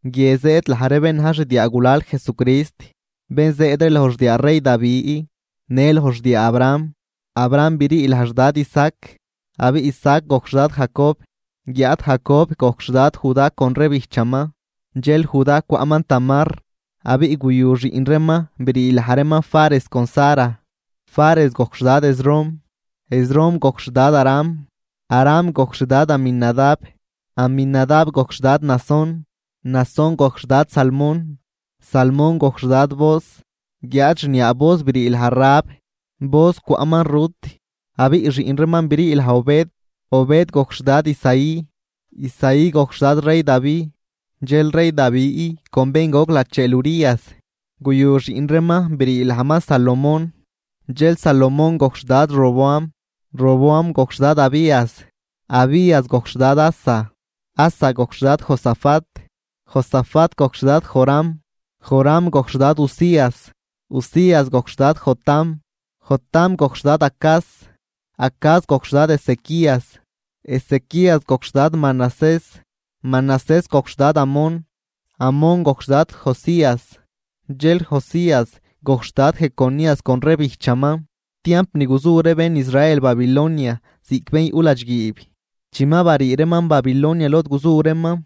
Guie zëëd laj ree bén na̱j xdiaagulal Jesucrist, bén zëëd ree loj xdiaa rey Davi në loj xdiaa Abraham. Abraham brii laj xdad Isaac, abiꞌ Isaac gojc xdad Jacob, guiáad Jacob gojc xdad Judá con ree bijchaman. Dxel Judá cwaꞌman Tamar, abiꞌ guyu xiꞌn reeman brii laj reeman Fares con Zara. Fares gojc xdad Esrom, Esrom gojc xdad Aram. Aram gojc xdad Aminadab, Aminadab gojc xdad Naasón, Naasón gojc xdad Salmón. Salmón gojc xdad Booz, guiáad xniaa Booz brii laj Rahab. Booz cwaꞌman Rut, abiꞌ xiꞌn reeman brii laj Obed. Obed gojc xdad Isaí, Isaí gojc xdad rey Davi. Dxel rey Davi con bén goc lacheel Urías guyu xiꞌn reeman brii lajman Salomón. Dxel Salomón gojc xdad Roboam, Roboam gojc xdad Abías, Abías gojc xdad Asa. Asa gojc xdad Josafat, Josafat gojc xdad Joram, Joram gojc xdad Uzías. Uzías gojc xdad Jotam, Jotam gojc xdad Acaz, Acaz gojc xdad Ezequías. Ezequías gojc xdad Mainán, Mainán gojc xdad Amón, Amón gojc xdad Josías. Dxel Josías gojc xdad Jeconías con ree bijchaman, tiamp ni guzu ree bén Israel Babilonia ziꞌc bén yuꞌ ladxguiib. Chi ma barii reeman Babilonia lod guzu reeman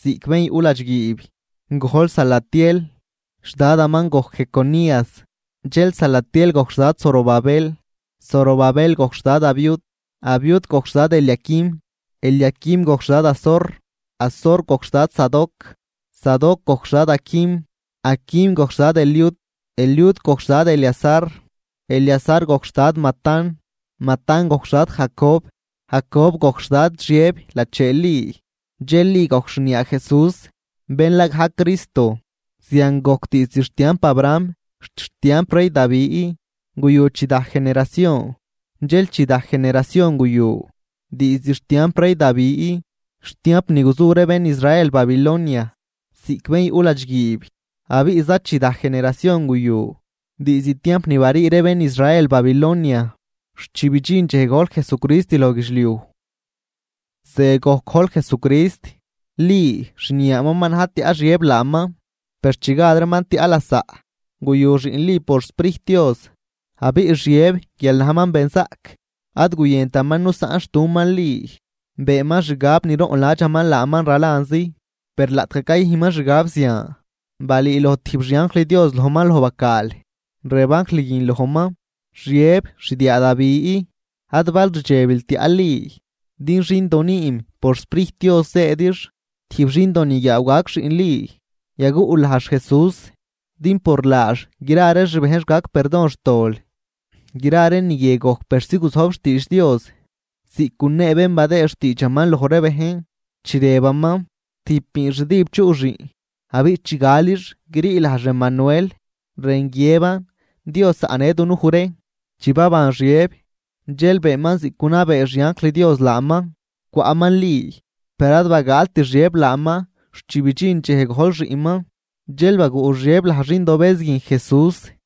ziꞌc bén yuꞌ ladxguiib, gojl Salatiel, xdadaman gojc Jeconías. Dxel Salatiel gojc xdad Zorobabel. Zorobabel gojc xdad Abiud, Abiud gojc xdad Eliaquim. Eliaquim gojc xdad Azor, Azor gojc xdad Sadoc, Sadoc gojc xdad Aquim. Aquim gojc xdad Eliud, Eliud gojc xdad Eleazar. Eleazar gojc xdad Matán, Matán gojc xdad Jacob. Jacob gojc xdad Xiëb lacheel Li. Dxel Li gojc xniaa Jesús, bén la gajc Cristo. Zian gojc, diizd xtiamp Abraham xt xtiamp rey Davi, guyu chidaj generacion, dxel chidaj generacion guyu diizd xtiamp rey Davi xt tiamp ni guzu ree bén Israel Babilonia ziꞌc bén yuꞌ ladxguiib, abiꞌ zachidaj generacion guyu diizd tiamp ni barii ree bén Israel Babilonia xt chi bidxin dxej gojl Jesucrist loj guidxliuj. Ze gojc gojl Jesucrist: Li, xniaaman, ma na̱j tiaꞌ Xiëb laaman. Per chi gad reeman tiaꞌ lasaꞌ, guyu xiꞌn Li por xSprijt Dios. Abiꞌ Xiëb guial najman benzaꞌc, ad guyëntaman nusaꞌnxtuman Li. Beenman xgab niroꞌnladxaman laaman ralanzi. Per laꞌtgaj cayüjnman xgab zian, balüüloj tijb xianjl Dios lojman loj bacaal, rëb anjl guin lojman: ―Xiëb, xdiaa Davi, ad bal rdxebil tiaꞌl Li, din xindo nüüm por xSprijt Dios zëëdix. Tijb xindoniguiaaw gac xiꞌn Li, yaguꞌl lajx “Jesús”, din por laax gra ree xbejnx gac perdon xtol. Gra ree ni guie gojc persi guzojb xtiidx Dios ziꞌc gunee bén badëë xtiidxaman loj ree bejn, chi rëbaman: Tijb biinxdüb chuꞌ xiꞌn, abiꞌ chi galix grii lajx Emanuel, rën guiëban: Dios zaꞌnë dunuj ree. Chi baban Xiëb, dxel beenman ziꞌc gunabee xianjl Dios laaman, cwaꞌman Li, per ad bagaalt Xiëb laaman xt chi bidxin dxej gojl xiꞌnman. Dxel baguꞌ Xiëb laj xindobëz guin JESÚS.